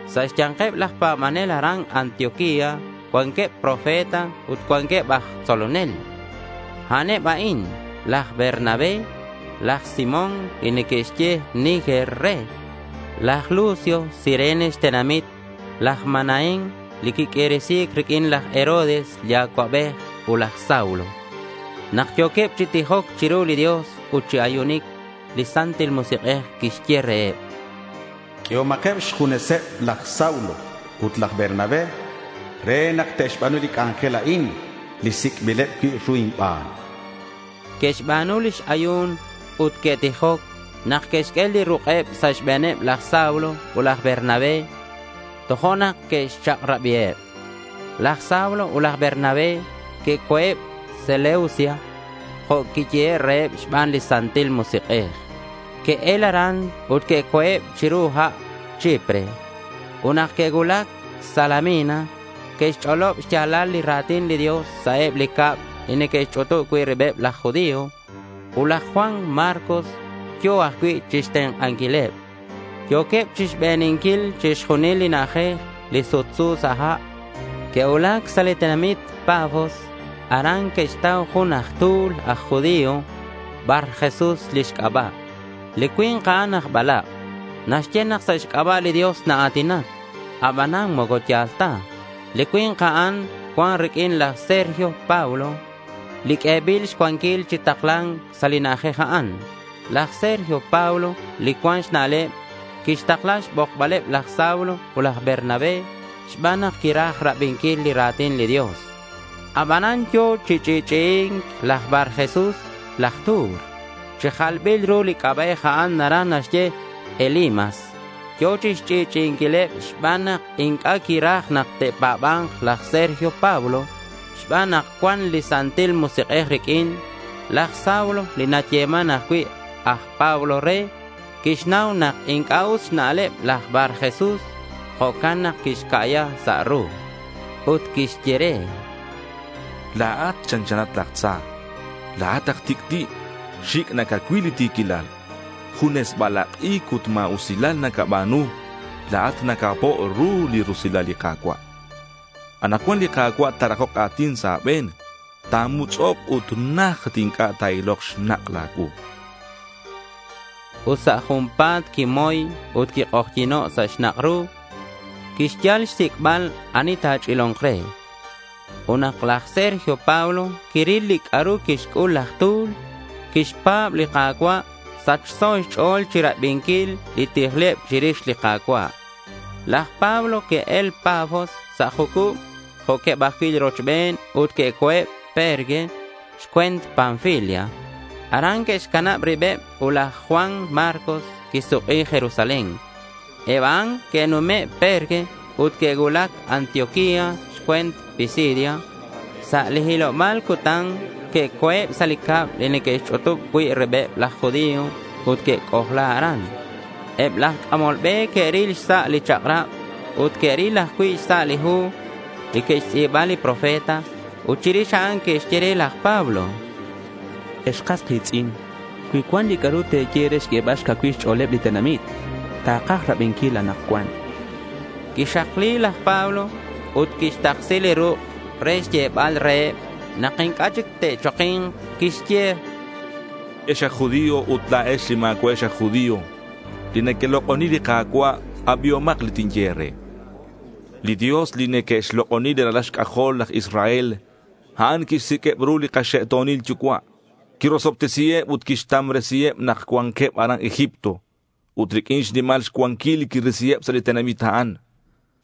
Sa' xya̱nkeb laj pa̱banel aran Antioquía cuanqueb profeta ut cuanqueb aj tzolonel. A'aneb a'in: laj Bernabé, laj Simón li neque'xye Niger re, laj Lucio Cirene xtenamit, laj Manaén li quiq'uiresi̱c riq'uin laj Herodes li acuabej, ut laj Saulo. Nak yo̱queb chi tijoc chiru li Dios ut chi ayunic, li Santil Musik'ej quixye reheb: —Q'uehomakeb xjuneseb laj Saulo ut laj Bernabé re nak te'xba̱nu li c'anjel a'in li sic'bileb cui' ru inban, chan. Que'xba̱nu lix ayu̱n ut que'tijoc nak que'xq'ue li ruk'eb sa' xbe̱neb laj Saulo ut laj Bernabé. Tojo'nak que'xchak'rabiheb. Laj Saulo ut laj Bernabé que'co̱eb Seleucia jo' quiyehe' reheb xban li Santil Musik'ej. Que'el aran ut que'co̱eb chiru ha' toj Chipre. Ut nak que'cuulac Salamina, que'xch'olob xya̱lal li ra̱tin li Dios sa' eb li cab li neque'xch'utub cui' ribeb laj judío. Ut laj Juan Marcos yo̱ ajcui' chixtenk'anquileb. Yo̱queb chixbeninquil chixjunil li na'ajej li sutsu sa' ha'. Que'cuulac sa' li tenamit Pafos. Aran que'xtau jun aj tu̱l aj judío. Barjesús lix c'aba'. Li cui̱nk a'an aj balak'. Naxye nak sa' xc'aba' li Dios naa̱tinac. Abanan moco ya̱l ta. Li cui̱nk a'an cuan riq'uin laj Sergio Paulo, li q'uebil xcuanquil chi takla̱nc sa' li na'ajej a'an. Laj Sergio Paulo, li cuan xna'leb, quixtakla xbokbaleb laj Saulo ut laj Bernabé xban nak quiraj rabinquil li ra̱tin li Dios. Abanan yo̱ chi ch'i'ch'i'i̱nc laj Barjesús laj tu̱l. (Chi jalbil ru li c'aba'ej a'an naraj naxye Elimas.) Yo̱ chixch'i'ch'i'inquileb xban nak inc'a' quiraj nak ta̱pa̱ba̱nk laj Sergio Paulo. Xban nak cuan li Santil Musik'ej riq'uin, laj Saulo li nayeman ajcui' aj Pablo re, quixnau nak inc'a' us xna'leb laj Barjesús. Jo'can nak quixca'ya sa' ru. Ut quixye re: —La̱at chanchanat laj tza. La̱at aj tic'ti'. Xic' nacacuil li ti̱quilal. Junes balak'ic ut ma̱usilal nacaba̱nu. La̱at nacapo' ru li rusilal li Ka̱cua'. Anakcuan li Ka̱cua' ta̱rakok a̱tin sa' a̱be̱n. Tatmutz'ok' ut najt inc'a' ta̱ilok xnak' a̱cuu, chan laj Pablo. Ut sa' junpa̱t quimoy ut quik'ojyi̱no' sa' xnak' ru. Quixyal xsic'bal ani ta̱ch'ilo̱nk re. Ut nak laj Sergio Paulo quiril li c'a'ru quixc'ul laj tu̱l, quixpa̱b li Ka̱cua'. Sachso xch'o̱l chirabinquil li tijleb chirix li Ka̱cua'. Laj Pablo que'el Pafos sa' jucub jo'queb ajcui' li rochben ut que'co̱eb Perge xcue̱nt Panfilia. Aran que'xcanab ribeb ut laj Juan Marcos quisuk'i Jerusalén. Eb a'an que'nume' Perge ut que'cuulac Antioquía xcue̱nt Pisidia. Sa' li hiloba̱l cutan que'oc sa' li cab li neque'xch'utub cui' ribeb laj judío ut que'c'ojla aran. Eb laj c'amol be que'ril xsa' li chak'rab ut que'ril ajcui' xsa' li hu li que'xtz'i̱ba li profeta. Ut chirix a'an que'xye re laj Pablo: —Ex kas ki̱tz'in, cui cuan li c'a'ru te̱ye re xq'uebal xcacuil xch'o̱leb li tenamit, takaj rabinquil anakcuan, chanqueb. Quixakli laj Pablo ut quixtaksi li ruk' re xyebal reheb nak inc'a' chic te'choki̱nk. Quixye: —Ex aj judío ut la̱ex li ma̱cua'ex aj judío, li nequelok'oni li Ka̱cua', abihomak li tinye e̱re. Li Dios li neque'xlok'oni li ralal xc'ajol laj Israel, a'an quixsiq'ueb ru li kaxe'to̱nil yucua'. Quirosobtesiheb ut quixtamresiheb nak cuanqueb aran Egipto. Ut riq'uin xnimal xcuanquil quirisiheb sa' li tenamit a'an.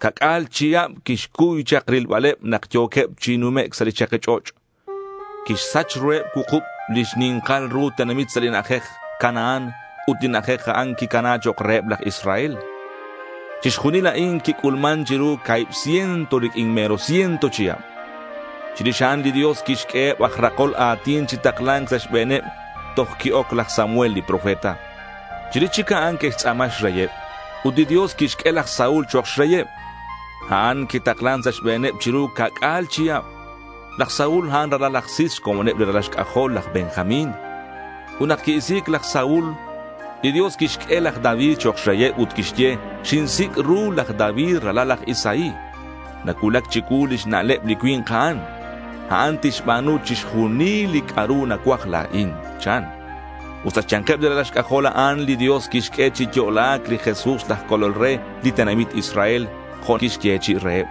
Ca'c'a̱l chihab quixcuy chak rilbaleb nak yo̱queb chak chi numec' sa' li chaki ch'och'. Quixsach ruheb cuukub li xni̱nkal ru tenamit sa' li na'ajej Canaán ut li na'ajej a'an quicana chok' reheb laj Israel. Chixjunil a'in quic'ulman chiru ca̱hib ciento riq'uin mero ciento chihab. Chirix a'an li Dios quixq'ueheb aj rakol a̱tin chi takla̱nc sa' xbe̱neb toj qui-oc laj Samuel li profeta. Chirix chic a'an que'xtz'a̱ma xreyeb. Ut li Dios quixq'ue laj Saúl chok' xreyeb. A'an quitaklan sa' xbe̱neb chiru ca'c'a̱l chihab. Laj Saúl a'an ralal laj Cis xcomoneb li ralal xc'ajol laj Benjamín. Ut nak qui-isi̱c laj Saúl, li Dios quixq'ue laj David chok' xreyeb ut quixye: —Xinsic' ru laj David ralal laj Isaí. Nacuulac chicuu lix na'leb li cui̱nk a'an. A'an tixba̱nu chixjunil li c'a'ru nacuaj la̱in, chan. Ut sa' xya̱nkeb li ralal xc'ajol a'an, li Dios quixq'ue chi yo'la̱c li Jesús laj Colol re li tenamit Israel jo' quixyechi'i reheb.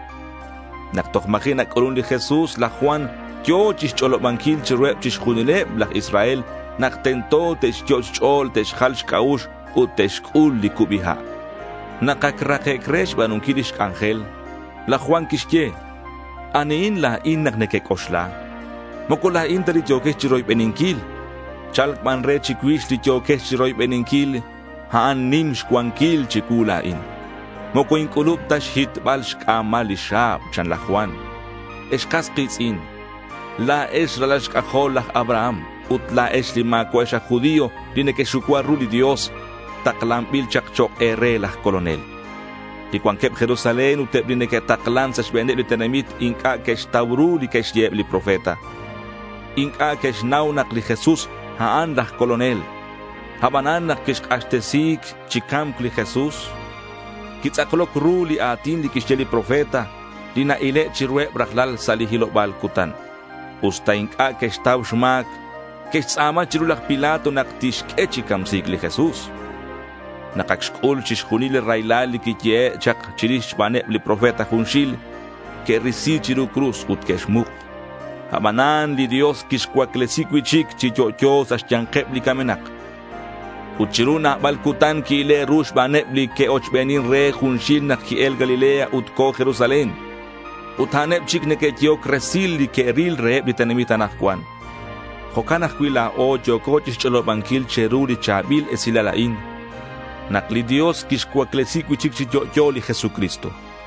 Nak toj ma̱ji' nac'ulun li Jesús, laj Juan yo̱ chixch'olobanquil chiruheb chixjunileb laj Israel nak tento te'xyot' xch'o̱l te'xjal xc'a'ux ut te'xc'ul li cubi ha'. Nak ac rakec' re xba̱nunquil lix c'anjel, laj Juan quixye, “¿Anihin la̱in nak nequec'oxla? Moco la̱in ta li yo̱quex chiroybeninquil. Cha̱lc ban re chicuix li yo̱quex chiroybeninquil. A'an nim xcuanquil chicuu la̱in. Moco inc'ulub ta xhitbal xc'a̱mal lix xa̱b,” chan laj Juan. Ex kas ki̱tz'in, la̱ex ralal xc'ajol laj Abraham, ut la̱ex li ma̱cua'ex aj judío li nequexucua ru li Dios, taklanbil chak chok' e̱re laj Colonel. Li cuanqueb Jerusalén ut eb li neque'taklan sa' xbe̱neb li tenamit inc'a' que'xtau ru li que'xye eb li profeta. Inc'a' que'xnau nak li Jesús, a'an laj Colonel. Abanan nak que'xk'axtesi chi ca̱mc li Jesús, quitz'akloc ru li a̱tin li que'xye li profeta, li na-ile' chiruheb rajlal sa' li hiloba̱l cutan. Usta inc'a' que'xtau xma̱c, que'xtz'a̱ma chiru laj Pilato nak tixq'ue chi camsi̱c li Jesús. Nak ac xc'ul chixjunil li raylal li quiyehe' chak chirix xbaneb li profeta junxil, que'risi chiru cruz ut que'xmuk. Abanan li Dios quixcuaclesi cui'chic chi yo'yo sa' xya̱nkeb li camenak. Ut chiru nabal cutan qui-ile' ru xbaneb li que'ochbenin re junxil nak qui-el Galilea ut co̱ Jerusalén. Ut a'aneb chic neque'yehoc resil li que'ril reheb li tenamit anakcuan. Jo'can ajcui' la̱o yo̱co chixch'olobanquil che̱ru li cha̱bil esilal a'in: nak li Dios quixcuaclesi cui'chic chi yo'yo li Jesucristo.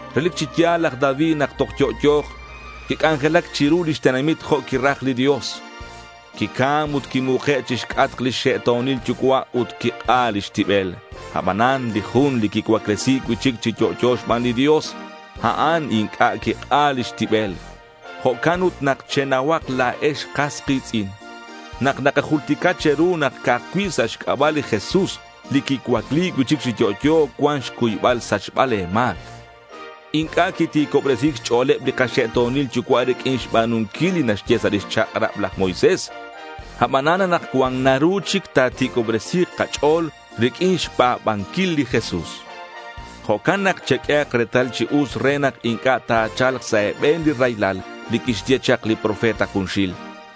Relic chi ya̱l laj David nak toj yo'yo̱k quic'anjelac chiru lix tenamit jo' quiraj li Dios. Quicam ut quimuke' chixc'atk lix xe'to̱nil yucua' ut quik'a lix tibel. Abanan li jun li quicuaclesi̱c cui'chic chi yo'yo xban li Dios, a'an inc'a' quik'a lix tibel. Jo'can ut nak chenauhak la̱ex, kas ki̱tz'in, nak nakajultica che̱ru nak ca'aj cui' sa' xc'aba' li Jesús li quicuacli cui'chic chi yo'yo cuan xcuybal xsachbal le̱ ma̱c. Inc'a' quiti̱cobresi̱c xch'o̱leb li kaxe'to̱nil yucua' riq'uin xba̱nunquil li naxye sa' lix chak'rab laj Moisés, abanan anakcuan naru chic ta̱ti̱cobresi̱k kach'o̱l riq'uin xpa̱banquil li Jesús. Jo'can nak cheq'uehak retal chi us re nak inc'a' ta̱cha̱lk sa' e̱be̱n li raylal li que'xye chak li profetas junxil.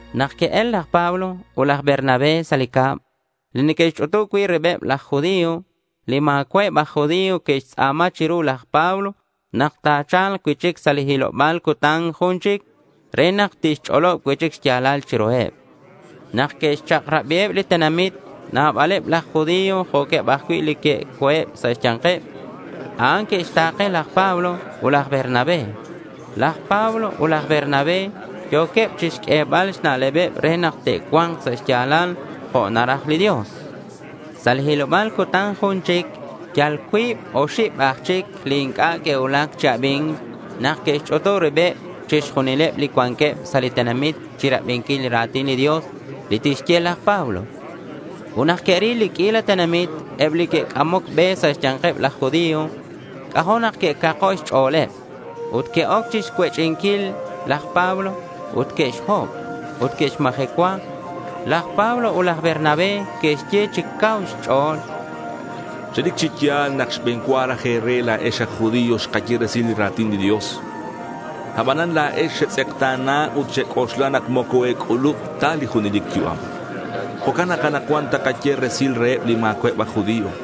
Nak que'el laj Pablo ut laj Bernabé sa' li cab li neque'xch'utub cui' ribeb laj judío, li ma̱cua'eb aj judío que'xtz'a̱ma chiru laj Pablo nak ta̱cha̱lk cui'chic sa' li hiloba̱l cutan jun chic re nak tixch'olob cui'chic xya̱lal chiruheb. Nak que'xchak'rabiheb li tenamit, nabaleb laj judío jo'queb ajcui' li que'oc sa' xya̱nkeb a'an que'xta̱ke laj Pablo ut laj Bernabé. Laj Pablo ut laj Bernabé yo̱queb chixq'uebal xna'lebeb re nak te'cua̱nk sa' xya̱lal jo' naraj li Dios. Sa' li hiloba̱l cutan jun chic, yal cuib oxib aj chic li inc'a' que'cuulac chi abi̱nc nak que'xch'utub ribeb chixjunileb li cuanqueb sa' li tenamit chirabinquil li ra̱tin li Dios li tixye laj Pablo. Ut nak que'ril li q'uila tenamit eb li neque'c'amoc be sa' xya̱nkeb laj judío, c'ajo' nak que'cako' xch'o̱leb. Que'oc chixcuech'inquil laj Pablo. Que'xhob ut que'xmajecua. Laj Pablo ut laj Bernabé que'xye chi cauheb xch'o̱l: —Relic chi ya̱l nak xbe̱n cua raj e̱re la̱ex aj judío xkaye resil li ra̱tin li Dios. Abanan la̱ex xetz'ekta̱na ut xec'oxla nak moco e̱c'ulub ta li junelic yu'am. Jo'can nak anakcuan takaye resil reheb li ma̱cua'eb aj judío.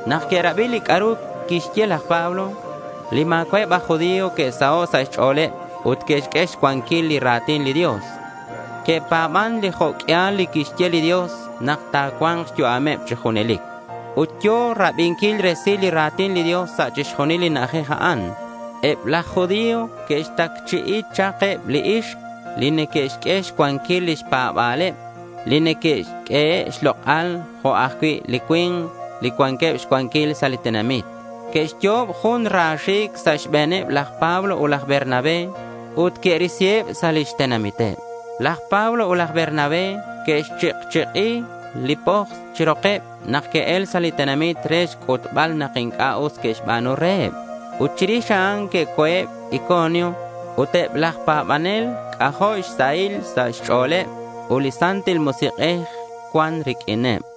Nak que'rabi li c'a'ru quixye laj Pablo, li ma̱cua'eb aj judío que'saho' sa' xch'o̱leb ut que'xq'ue xcuanquil li ra̱tin li Dios. Que'pa̱ban li jo' q'uial li quixye li Dios nak ta̱cua̱nk xyu'ameb chi junelic. Ut yo̱ rabinquil resil li ra̱tin li Dios sa' chixjunil li na'ajej a'an. Eb laj judío que'xtacchi'i chak eb li ixk li neque'xq'ue xcuanquil lix pa̱ba̱leb, li neque'q'uehe' xlok'al jo'queb ajcui' li cui̱nk li cuanqueb xcuanquil sa' li tenamit. Que'xyo'ob jun ra xi̱c' sa' xbe̱neb laj Pablo ut laj Bernabé. Ut que'risiheb sa' lix tenamiteb. Laj Pablo ut laj Bernabé que'xchik'chik'i li poks chi rokeb nak que'el sa' li tenamit re xc'utbal nak inc'a' us que'xba̱nu reheb. Ut chirix a'an que'co̱eb Iconio. Ut eb laj pa̱banel c'ajo' xsahil sa' xch'o̱leb ut li Santil Musik'ej cuan riq'uineb.